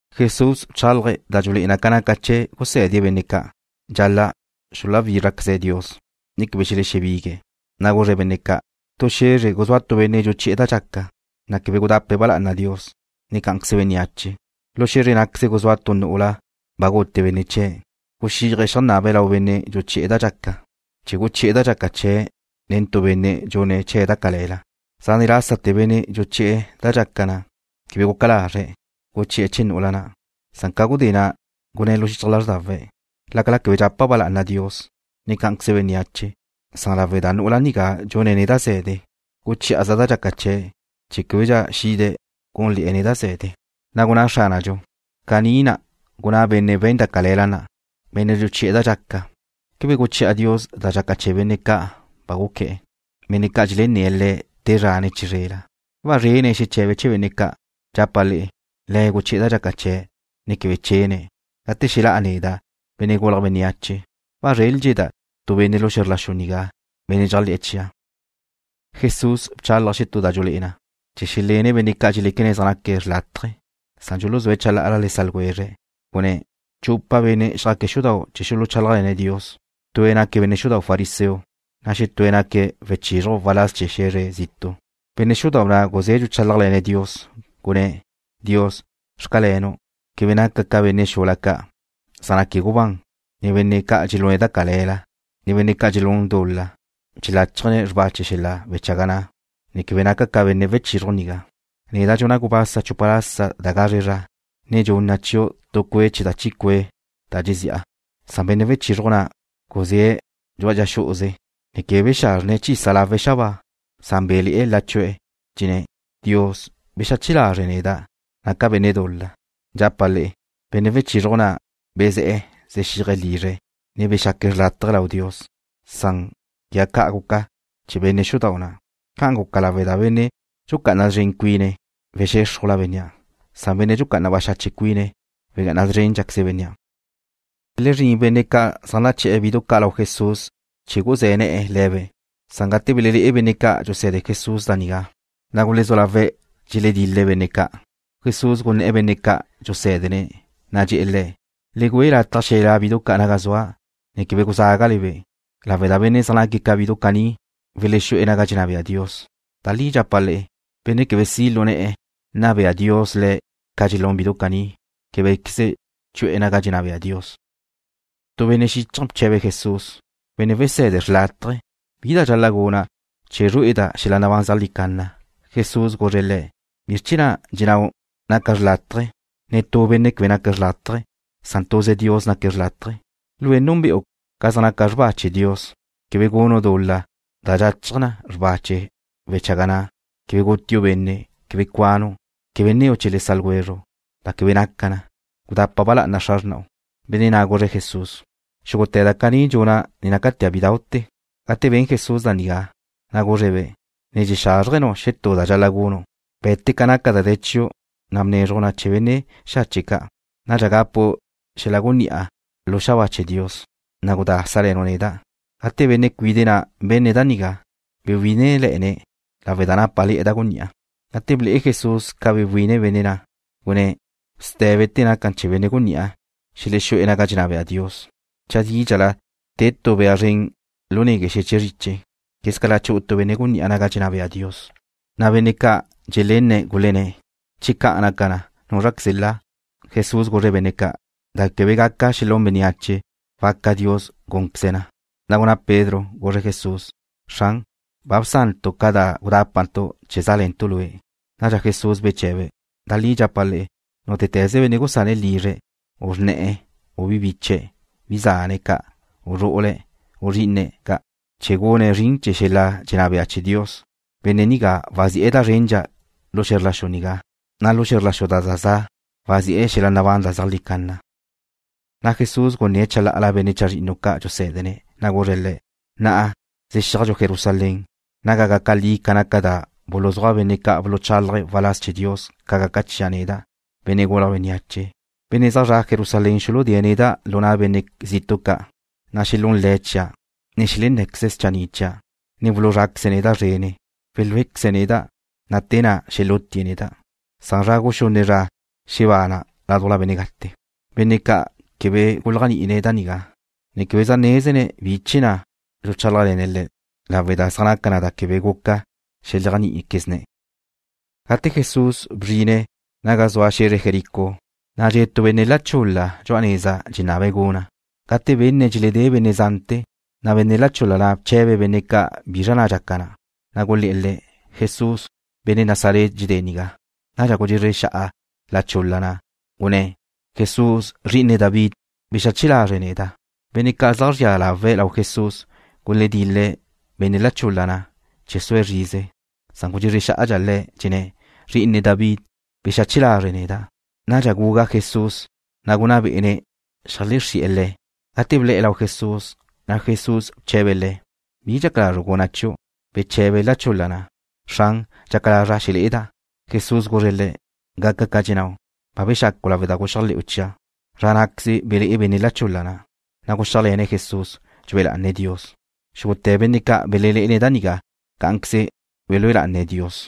Jesús bchálaje̱' da dxulé'e na ca naca chee̱ gusé̱dene̱' benne' ca' dxal-la' xuluwízrajtecaze̱' Dios, ne quebe xelexebigue̱'. Na' guzre̱' benne' ca': ―Tu xe̱zre guzúa tu benne' dxuchi'e̱ da dxaca, na' quebe gudape̱' ba lá'ana Dios, ne cá'anqueze bénneache. Lu xe̱zre ná'queze guzúa tu nu'ula ba gute benne' chee̱'. Guxíaje̱' xeajnabe̱' lau benne' dxuchi'e̱ da dxaca chee̱ guchi'e̱ da dxaca chee̱' nen tu benne' dxune̱' chee̱' da cale̱la. Zane' lásate̱ benne' dxuchi'e̱ da dxaca quebe guca lazre̱' guchi'e̱ chee̱ nu'ula na', san ca gudé na' gunné̱' lu xichaj lázrdawe̱': Lácala quebe dxapa' ba lá'ana Dios, ne cá'anqueze bénneache, san lawe' da nu'ula nigá dxune̱' neda' ze̱de, guchí'a chaza' da dxaca chee̱' chee̱ québedxa xide̱' gúnle̱'e̱ neda' ze̱de. Na' gunná Xránadxu: ―Caní na' gunná benne' we̱n da cale̱la na', benne' dxuchi'e̱ da dxaca. ¿Quebe guchi'a Dios da dxaca chee̱ benne' ca' ba guqué̱'e̱, benne' ca' dxelenné̱' Le̱' te zra, ne chizrela? ¿Wazrene̱' xeche̱be̱' chee̱ benne' ca'? Dxapa' le'e, Le̱' guchi'e̱ da dxaca chee̱', ne quebe chene̱'. Gate xelá'a neda', Benne' Gulje̱' Bénneache, ¿wazréldxeda' tu benne' lu xe̱zr la xu nigá, benne' dxéajle̱'e̱ chia'? Jesús bchálaje̱' xetú da dxulé'e na, chee̱ xelene benne' ca' dxeléquene̱' zaj naque̱' xrlátaje, san dxuluzúe̱' chalá'ala le sa' ljwezre̱'. Gunné̱': ―Chupa benne' xjaque̱' xudau' chee̱ xuluchálajle̱ne̱' Dios. Tue̱' naque̱' benne' xudau' fariseo, na' xetúe̱' naque̱' wechizruj waláz chee̱ xe̱zre zitu'. Benne' xudau' na' guzé̱' dxuchálajle̱ne̱' Dios, gunné̱': “Dios, xcalenu' quebe naca' ca benne' xula ca', zaj naque̱' gubán, ne benne' ca' dxelune̱' da cale̱la, ne benne' dxelún dul-la dxeláchajne̱' xrba chee̱ wechaga na', ne quegá ca benne' wechizruj nigá. Neda' dxuna' gubasa chupa lasa da gazre zra, ne dxunna' chiu' tu cue' chee̱ da chi cue' da dxezi'a.” Benne' wechizruj na' guzúe̱' dxu'a dxa xú'uze, ne quebe bexazrjne̱' chisa lawe̱' xabáa. Bé̱le̱'e̱ la chu'e̱, dxenné̱': “Dios, bexache lazre' neda', naca' benne' dul-la.” Dxapa' le'e, benne' wechizruj na' bezé̱'e̱ xexíaje̱' lizre̱', ne bexaque̱' xrlátaje lau Dios, san quegá caní guca chee̱ benne' xudau' na'. Ca' guca lawe' da benne' dxucá'ana szren cuine̱' wexéxrujla bénnea', san benne' dxucá'ana baxache' cuine̱' wegá'ana szrénqueze bénnea'. Belezrín benne' ca' zaj naché̱'e̱ bidu ca' lau Jesús chee̱ guzé̱ ne̱'e̱ le̱be'. Gate belelé'e benne' ca' dxuse̱de Jesús da nigá, na' gulezú lawe̱' dxeledil-le̱' benne' ca'. Jesús gunné̱' benne' ca' dxusé̱dene̱', na' dxe̱'e̱ le̱': ―Le güe lataj xelelá' bidu ca' naga zua', ne quebe guzágale-be', lawe' da benne' zaj naque̱' ca bidu caní welexu'e̱ naga dxenná bea Dios. Da li dxapa' le'e, benne' quebe si' lu ne̱'e̱ nna bea Dios le̱' ca dxelún bidu caní, québequeze chu'e̱ naga dxenná bea Dios. Tu benne' xíchaje̱ bche̱be̱' Jesús: ―Benne' Wese̱de xrlátaje, ¿bi da dxal-la' guna' chee̱ zrué'eda' xel-la nabán zeajlí canna? Jesús guzre̱' le̱': ―¿Bizr chee̱ na' dxennáu' naca' xrlátaje? Netú benne' quebe naque̱' xrlátaje. Tuze Dios naque̱' xrlátaje. Lue' núnbe'u ca zaj naca xrba chee̱ Dios: Quebe gunu' dul-la da dxachaj na xrba chee̱ wechaga na'. Quebe gutiu' benne'. Quebe cuanu'. Quebe nneu' chee̱ le sa' ljwezru' da quebe naca na. Gudapa ba lá'ana xra xrna'u. Benne' na' guzre̱' Jesús: ―Xúgute̱ da caní dxuna' ne nácatea' bídau'te̱. Gate ben Jesús da nigá, na' guzre̱'-be': ―Ne dxexázrjenu' xetú da dxal-la' gunu'. Be̱te ca naca da de̱ chiu', na' bnezruj na chee̱ benne' xache' ca'. Nadxa gapu' xel-la gunní'a lu xabáa chee̱ Dios. Na' gudá sále̱nu' neda'. Gate benne' cuide' na' benne̱' da nigá, bewí'inele̱'e̱ne̱' lawe' da nápale̱'e̱ da gunní'a. Gate ble'e Jesús ca bewi'ine benne' na', gunné̱': ―Sté̱bete̱ naca chee̱ benne' gunní'a ca' xelexú'e̱ naga dxenná bea Dios. Chadídxala te tu bea zren lu negue' tu xeche' zriche quegala chu'u tu benne' gunní'a naga dxenná bea Dios. Na' benne' ca' dxelenne̱' gulenné̱': ―Che ca' naca na, ¿núzraqueze la? Jesús guzre̱' benne' ca': ―Da quebe gaca xelún bénneache, waca Dios gúnqueze̱' na. Na' gunná Pedro, guzre̱' Jesús: ―Xran, ba bsantu' ca da gudápantu' chee̱ zále̱ntu' Lue'. Nadxa Jesús beche̱be̱': ―Da li dxapa' le'e, nútete̱ze benne' gusane̱' lizre̱', u xra xrne̱'e̱, u bi biche̱', bi zane̱' ca', u zru'ule̱', u zrí'ine̱' ca', chee̱ gune̱' zrin chee̱ xel-la dxenná bea chee̱ Dios, benne' nigá wazi'e̱ da zrendxa lu xe̱zr la xu nigá, na' lu xe̱zr la xu da za za' wazi'e̱ xel-la nabán da zeajlí canna. Na' Jesús gunné̱' chalá'ala benne' chazrinnu ca' dxusé̱dene̱', na' guzre̱' le̱': ―Na'a zexíajdxu Jerusalén, naga gaca li ca naca da buluzúaj benne' ca' buluchálaje̱' waláz chee̱ Dios ca gaca chia' neda', Benne' Gulje̱' Bénneache. Benne' zaj zre̱'e̱ Jerusalén xuludée̱' neda' lu na' benne' zitu' ca', na' xelún le̱' chia', ne xelenné̱queze̱' schanni' chia', ne wuluzráqueze̱' neda' zrene̱'. Welúequeze̱' neda', na' te na' xelútie̱' neda', na' zra guxunne' zra xebana' ládujla benne' gate. Benne' ca' quebe guléajni'ine̱' da nigá, ne quebe zaj nézene̱' bi chee̱ na' dxuchálajle̱ne̱' le̱', lawe' da zaj naca da quebe guca xeléajni'iquezne̱'. Gate Jesús bzrine̱' gagu naga zua xe̱zre Jericó, na' dxe' tu benne' la chul-la dxu'a neza dxenabe̱' guna'. Gate benne̱' dxeledé benne' zante̱, na' benne' la chul-la na' bche̱be̱' benne' ca' bizra na' dxaca na. Na' gulé̱'e̱ le̱': ―Jesús, benne' Nazaret dxedée̱' nigá. Nadxa gudxezre xa'a la chul-la na', gunné̱': ―¡Jesús, Zri'ine David, bexache lazre' neda'! Benne' ca' zaj zria lawe̱' lau Jesús guledil-le̱' benne' la chul-la na' chee̱ sue̱' zrize, san gudxezre xá'adxa le̱', dxenné̱': ―¡Zri'ine David, bexache lazre' neda'! Nadxa gugá Jesús, na' gunná bé'ene̱' xeajlexrí'e̱ le̱'. Gate ble̱'e̱ lau Jesús, na' Jesús bche̱be̱' le̱': ―¿Bi dxaca lazru' guna' chiu'? Beche̱be la chul-la na': ―Xran, dxaca lazra' xelé'eda'. Jesús guzre̱' le̱': ―Gaca ca dxennáu'. Ba bexacu' lawe' da guxéajle̱'u chia'. Zra ná'queze belé'e benne' la chul-la na', na' guxíajle̱ne̱' Jesús, dxue lá'ane̱' Dios. Xúgute̱ benne' ca' belelé'ene̱' da nigá cá'anqueze belúe lá'ane̱' Dios.